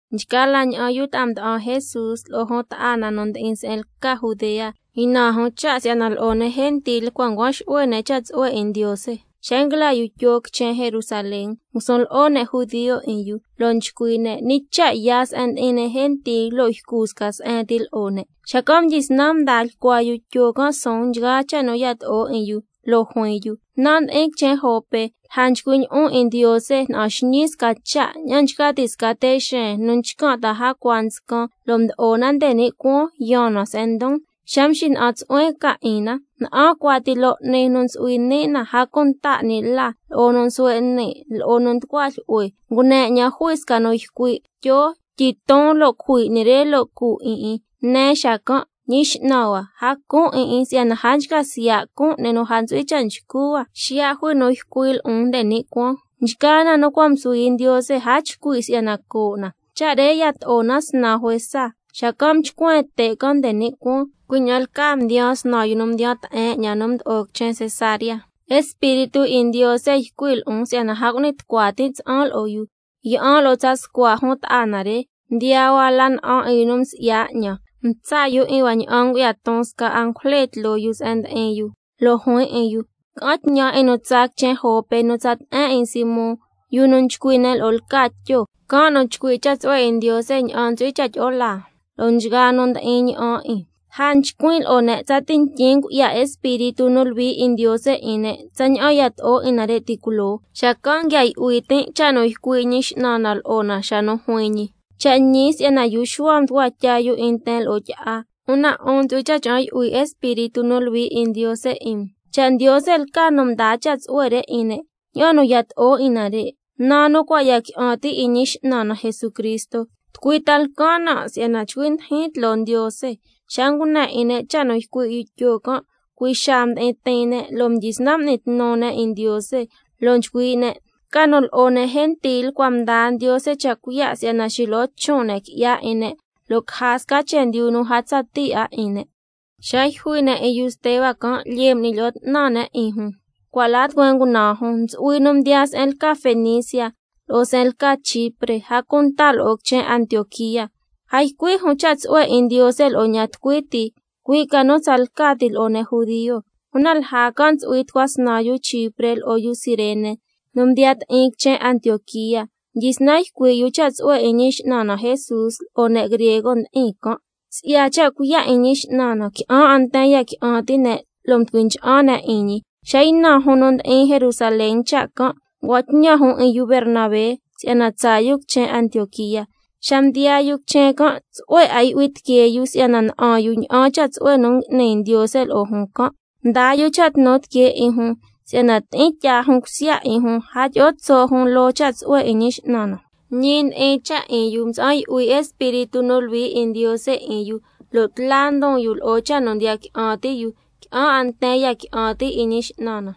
Nchgaa la ña'an yu ta'a mda'an Jesús, lo'o jun ta'a na nu ndi'in se'en lca Judea, ynan jun cha' si'yana lo'o ne' gentil cua' ncuan xu'hue ne' cha' tsu'hue 'in Ndiose. Xa nguila yu Tyo quichen Jerusalén, ngusun lo'o ne' judio 'in yu, lo' nchcui' ne': ¿Ñi cha' yaa se'en ndi'in ne' gentil lo' ycu sca se'en ti lo'o ne'? Xacan' mdyisnan mdaa lyicua yu Tyo can' suun nchgaa cha' nu yato'o 'in yu, lo' juin yu: Nan' mdi'in quichen Jope, lja nchcuin' lyi'on 'in Ndiose, na'an xñii sca cha' ña'an nchca ti' sca te' xeen nu nchcan' ta'a jacua nscan, lo' mdo'o na nde ni' cuaan yaan na se'en ndon. Xa mxina'an tsu'huen can 'in na, na'an cuati loo 'ni nu ntsu'hui ni' na, a cunta 'ni la, lo'o nu nsuhue' ni', lo'o nu nducua jlyu'hue. Ngune 'ñan jui sca nu ycui': Tyo, tyiton lo' cujui 'ni re lo' cu 'in 'in. Nen xacan': Ñi X'nan hua, a cun 'in 'in si'yana a nchca siya' cun 'ni nu a ntsu'hui cha' nchcu hua. Xiya' jui nu ycui' lo'on nde ni' cuaan: Nchgaa na nu cua' msuhui Ndiose, a chcui' si'yana coo' na. Cha' re yato'o na snan juesa, xacan' mchcuen te' can' nde ni' cuaan. Cui' ña'an lcaa mdiyaan snan yu nu mdiyan te'en 'ñan nu mdo'o quichen Cesarea. Espíritu 'in Ndiose ycui' lo'on si'yana a cu'ni tucua tin' tsa'an lo'o yu. Yi'an lo'o tsa scua jun ta'a na re, mdiyaa hua la na'an 'in yu nu msi'ya 'ñan, mtsa' yu 'in hua ña'an ngu'ya ton sca angujle tloo yu se'en ndi'in yu, lo' juin 'in yu: Ca'an tñan 'in nu tsaa quichen Jope nu tsa te'en 'in Simón, yu nu nchcui' ne' lo'o lca Tyo, can' nu chcui' cha' tsu'hue 'in Ndiose ña'an ntsu'hui cha' tyi'o laa, lo'o nchgaa nu ndi'in na'an 'in. Lja nchcuin' lo'o ne' tsati ntyin ngu'ya Espíritu nu Luhui 'in Ndiose 'in ne', tsaña'an yato'o 'in nare' ti' culoo. Xacan' nguia yu'hui tin' cha' nu ycui' Ñi X'nan na lo'o na xa nu juin ñi: Cha' ñi si'yana yu Xuhua mducua tya yu 'in nten lo'o tyi'a, una 'un ntsu'hui cha' cha'an yu'hui Espíritu nu Luhui 'in Ndiose 'in um. Cha' Ndiose lca nu mdaa cha' tsu'hue re 'in ne', ña'an nu yato'o 'in nare', naa nu cua' ya qui'an ti' 'in Ñi X'nan na Jesucristo, ¿tucui ta lcan nan' si'yana chcui ndijin tloo Ndiose? Xa ngune 'in ne' cha' nu ycui' yu Tyo can', cui' xaa mdi'in tiin ne' lo' mdyisnan m'ni tnu ne' 'in Ndiose, lo' nchcui' ne': Ca nu lo'o ne' gentil cua' mdaa Ndiose cha' cuiya' si'yana xilo'o chon' ne' qui'ya 'in ne', lo' caja sca chendyu nu a tsa ti 'a 'in ne'. Ti' xa nu yjui ne' 'in yu Steba can' m'ni lyi'o 'tnan ne' 'in jun, cua' la tucueen ngunaan jun, ntsu'hui nu mdiyaa se'en lca Fenicia, lo'o se'en lca Chipre, a cunta lo'o quichen Antioquía mdiyaa jun. Una a ycui' jun cha' tsu'hue 'in Ndiose lo'o ña'an tucui ti, cui' ca nu tsalca ti lo'o ne' judio. Una lja can' ntsu'hui tucua snan yu Chipre lo'o yu Cirene nu mdiya ti'in quichen Antioquía, mdyisnan ycui' yu cha' tsu'hue 'in Ñi X'nan na Jesús lo'o ne' griego ndi'in can'. Si'ya cha' cuiya' 'in Ñi X'nan na, qui'an 'a nten ya qui'an ti' ne' lo' mducui ncha'an ne' 'in ñi. Xa ynan jun nu ndi'in quichen Jerusalén cha' can', ngua'an tñan jun 'in yu Bernabé si'yana tsaa yu quichen Antioquía. Una xa mdiyaa yu quichen can', tsu'hue 'a yu'hui tiquee yu si'yana na'an yu ña'an cha' tsu'hue nu ngui'ni Ndiose lo'o jun can'. Mdaa yu cha' tnu tiquee 'in jun si'yana tyi'in tyaa jun cusya 'in jun, a tyi'o tso' jun loo cha' tsu'hue 'in Ñi X'nan na. Ñi ndi'in cha' 'in yu, mtsa'an yu'hui Espíritu nu Luhui 'in Ndiose 'in yu, a cunta lo'o cha' nu ndiya qui'an ti' yu. Lo' qui'an 'a nten ya qui'an ti' 'in Ñi X'nan na.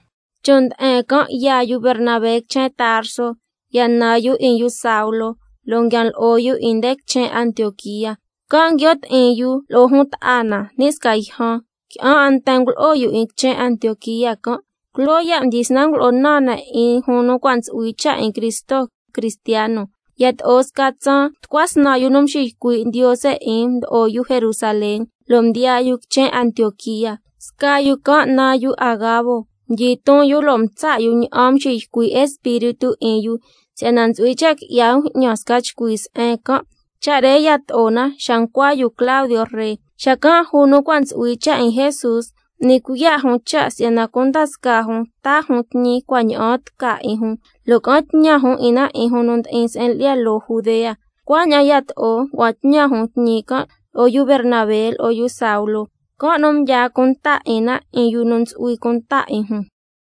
Chon' nde'en can' yaa yu Bernabé quichen Tarso, ya nan yu 'in yu Saulo, lo' nguian lo'o yu 'in nde quichen Antioquía. Can' nguio' ti'in yu lo'o jun ta'a na ni' sca yjan, qui'an 'a nten ngulo'o yu 'in quichen Antioquía can'. Culoo ya' mdyisnan ngulo'o naan ne' 'in jun nu cua' ntsu'hui cha' 'in Cristo: Cristiano. Yato'o sca tsaan, tucua snan yu nu nxiycui' Ndiose 'in mdo'o yu Jerusalén, mdiyaa yu quichen Antioquía. Sca yu can' naan yu Agabo, mdyiton yu lo' mtsa' yu ña'an mxiycui' Espíritu 'in yu, si'yana ntsu'hui cha' qui'ya bju'ñan sca chcui se'en can'. Cha' re yato'o na xa ncua yu Claudio ree. Xacan' nchgaa jun Antioquía nu cua' ntsu'hui cha' 'in Jesús, m'ni cuiya' jun cha' si'yana cunda scaa jun taa jun tñi cua' ña'aan tca 'in jun, lo' ca'an tñan jun 'in na 'in jun nu ndi'in se'en lyi'ya loo Judea. Cuaña'an yato'o, ngua'an tñan jun tñi can' lo'o yu Bernabé lo'o yu Saulo, can' nu mdyaa cunta 'in na 'in yu nu ntsu'hui cunta 'in jun.